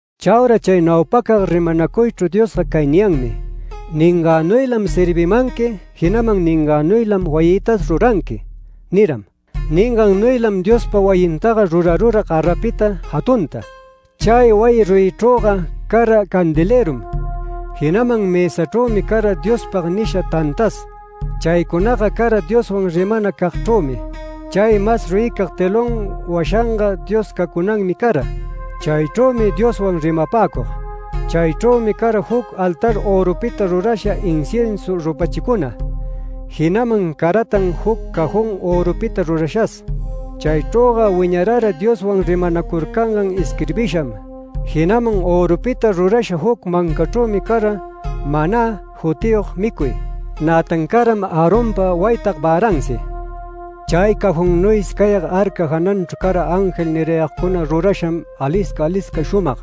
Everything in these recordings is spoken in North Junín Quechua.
Chaura chay naupacag rimanacuychru Diosga cay niyanmi: “Ningänuylam servimanqui, jinaman ningänuylam wayïtas ruranqui” niram. Ningannuylam Diospa wayintaga rurarura garapita jatunta. Chay wayi ruyichrüga cara candelërum, jinaman mësachrümi cara ‘Diospag’ nisha tantas. Chaycunaga cara Dioswan rimanacagchrümi. Chay mas ruyicag telón washanga Dios cacunanmi cara. Chaychrümi Dioswan rimapäcug. Chaychrümi cara juc altar örupita rurasha inciensu rupachicuna, jinaman caratan juc cajón örupita rurashas. Chaychrüga wiñarara Dioswan rimanacurcangan isquirbisham, jinaman örupita rurasha juc mancachrümi cara ‘manä’ jutiyog micuy. Nätan caram Aaronpa waytag väransi. Chay cajonnuysi cayag ‘arca’ jananchru cara ángel nirayagcuna rurasham, alisca alisca shumag.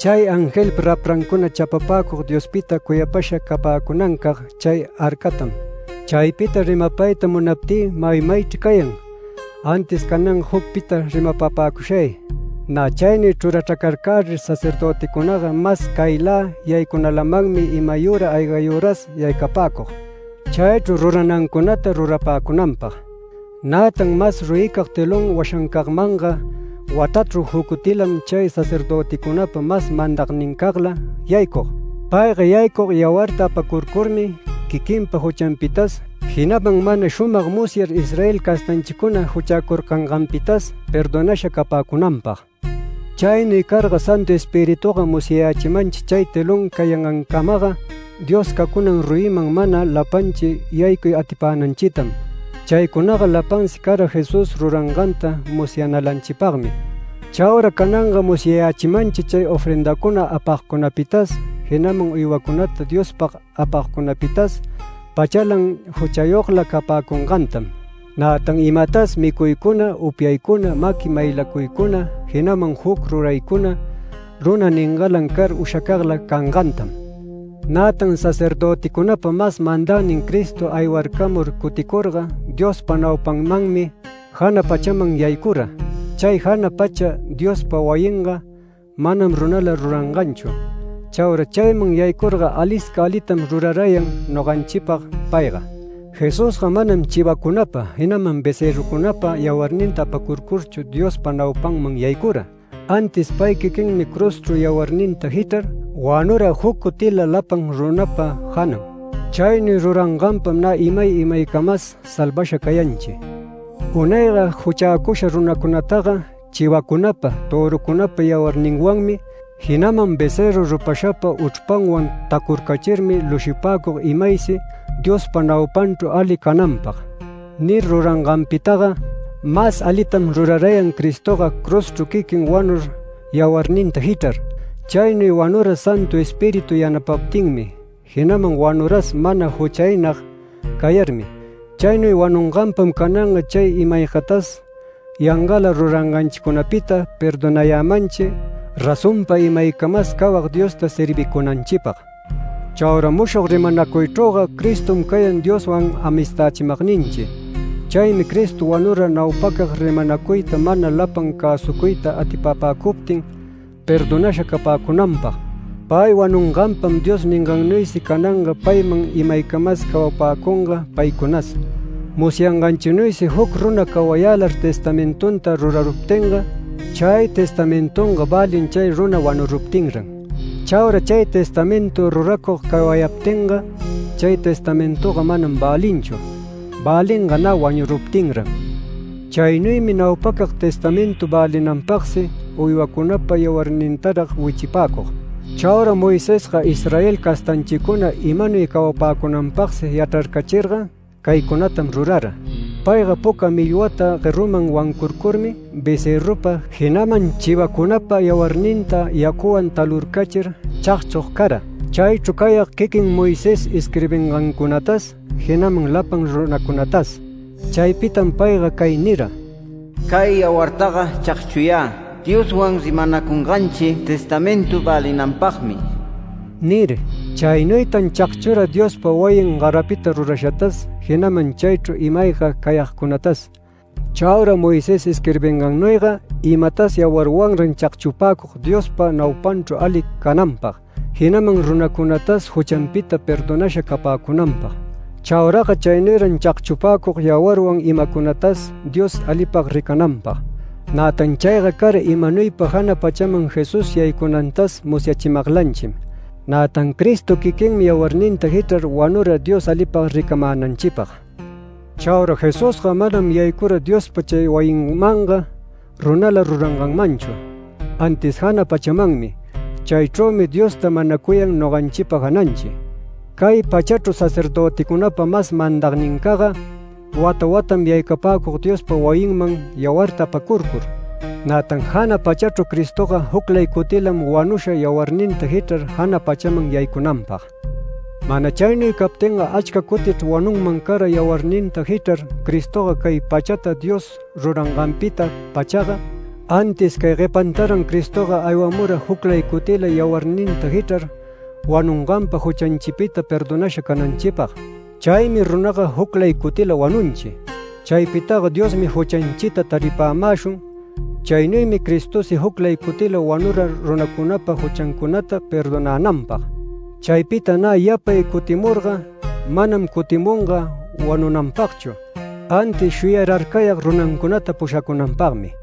Chay angelpa raprancuna chapapäcug Diospita cuyapasha capäcunancag chay arcatam. Chaypita rimapayta munaptï mayamaychri cayan, antis cananga jucpita rimapapäcushay. Nä chaynuy chrurachracarcärir sacerdöticunaga mas caylä yaycunalamanmi imayüra aygayüras yaycapäcug. Chaychru ruranancunata rurapäcunanpag. Nätan mas ruyicag telón washancagmanga watachru juc cutilam chay sacerdöticunapa mas mandagnincagla yaycug. Payga yaycug yawarta apacurcurmi quiquinpa juchanpitas, jinaman mana shumag musyar Israel castanchicuna juchäcurcanganpitas perdonasha capäcunanpag. Chaynuy carga Santu Espirituga musyayächimanchi chay telón cayangancamaga Dios cacunan ruyiman mana lapanchi yaycuy atipänanchitam. Chaycunaga lapansi cara Jesús ruranganta musyanalanchipagmi. Chaura cananga musyayächimanchi chay ofrendacuna apagcunapitas, jinaman uywacunata Diospag apagcunapitas pachalan juchayogla capäcungantam. Nätan imatas micuycuna, upyaycuna, maqui maylacuycuna, jinaman juc ruraycuna, runa ningalan car ushacagla cangantam. Nätan sacerdöticunapa mas mandagnin Cristo aywarcamur cuticurga Diospa naupanmanmi jana pachaman yaycura. Chay jana pacha Diospa wayinga manam runala ruranganchu. Chaura chayman yaycurga alisca alitam rurarayan noganchipag payga. Jesusga manam chivacunapa, jinaman becërrucunapa yawarninta apacurcurchu Diospa naupanman yaycura, antis pay quiquinmi cruzchru yawarninta jichrar wanura juc cutila lapan runapa janan. Chaynuy ruranganpam nä imay imaycamas salvasha cayanchi. Unayga juchäcusha runacunataga chivacunapa, törucunapa yawarninwanmi, jinaman becërru rupashapa uchrpanwan tacurcachirmi lushipäcug imaysi “Diospa naupanchru ali cananpag” nir ruranganpitaga mas alitam rurarayan Cristoga cruzchru quiquin wanur yawarninta jichrar. Chaynuy wanura Santu Espíritu yanapaptinmi, jinaman wanuras mana juchaynag cayarmi. Chaynuy wanunganpam cananga chay ima-aygatas yangala ruranganchicunapita perdonayämanchi razonpa imaycamas cawag Diosta servicunanchipag. Chaura mushog rimanacuychrüga Cristom cayan Dioswan amistächimagninchi. Chaymi Cristo wanura naupacag rimanacuyta mana lapan cäsucuyta atipapäcuptin perdonasha capäcunanpag. Pay wanunganpam Dios ningannuysi cananga paywan imaycamas cawapäcunga paycunas. Musyanganchinuysi juc runa cawayälar testamentunta ruracuruptinga, chay testamentunga välin chay runa wanuruptinran. Chaura chay testamentu ruracug cawayaptinga, chay testamentunga manam välinchu. Välinga nä wanuruptinran. Chaynuymi naupacag testamentu välinanpagsi uywacunapa yawarnintarag wichipäcug. Chaura Moisesga Israel castanchicuna imanuy cawapäcunanpagsi yachrarcachirga caycunatam rurara: Payga puca milwata gueruman wancurcurmi becërrupa, jinaman chivacunapa yawarninta yacuwan talurcachir chagchug cara, chaychru cayag quiquin Moisés isquirbingancunatas, jinaman lapan runacunatas. Chaypitam payga cay nira: “Cay yawartaga chagchuyä Dioswan rimanacunganchi testamentu välinanpagmi” nir. Chaynuytan chagchura Diospa wayin garapita rurashatas, jinaman chaychru ima-ayga cayagcunatas. Chaura Moisés isquirbingannuyga imatas yawarwanran chagchupäcug Diospa naupanchru ali cananpag, jinaman runacunatas juchanpita perdonasha capäcunanpag. Chauraga chaynuyran chagchupäcug yawarwan imacunatas Dios alipag ricananpag. Nätan chayga cara imanuypa jana pachaman Jesús yaycunantas musyachimaglanchim. Nätan Cristo quiquinmi yawarninta jichrar wanura Dios alipag ricamänanchipag. Chaura Jesusga manam yaycura Diospa chay wayinmanga runala ruranganmanchu, antis jana pachamanmi. Chaychrümi Diosta manacuyan noganchipa jananchi. Cay pachachru sacerdöticunapa mas mandagnincagga wata watam yaycapäcug Diospa wayinman yawarta apacurcur. Nätan jana pachachru Cristoga juclay cutilam wanusha yawarninta jichrar jana pachaman yaycunanpag. Mana chaynuy captinga achca cutichr wanunman cara yawarninta jichrar Cristoga cay pachata Dios ruranganpita-pachaga. Antis cay guepantaran Cristoga aywamura juclay cutila yawarninta jichrar wanunganpa juchanchipita perdonasha cananchipag. Chaymi runaga juclay cutila wanunchi. Chaypitaga Diosmi juchanchita taripämäshun. Chaynuymi Cristosi juclay cutila wanura runacunapa juchancunata perdonänanpag. Chaypita nä yapay cutimurga manam cutimunga wanunanpagchu antis shuyararcayag runancunata pushacunanpagmi.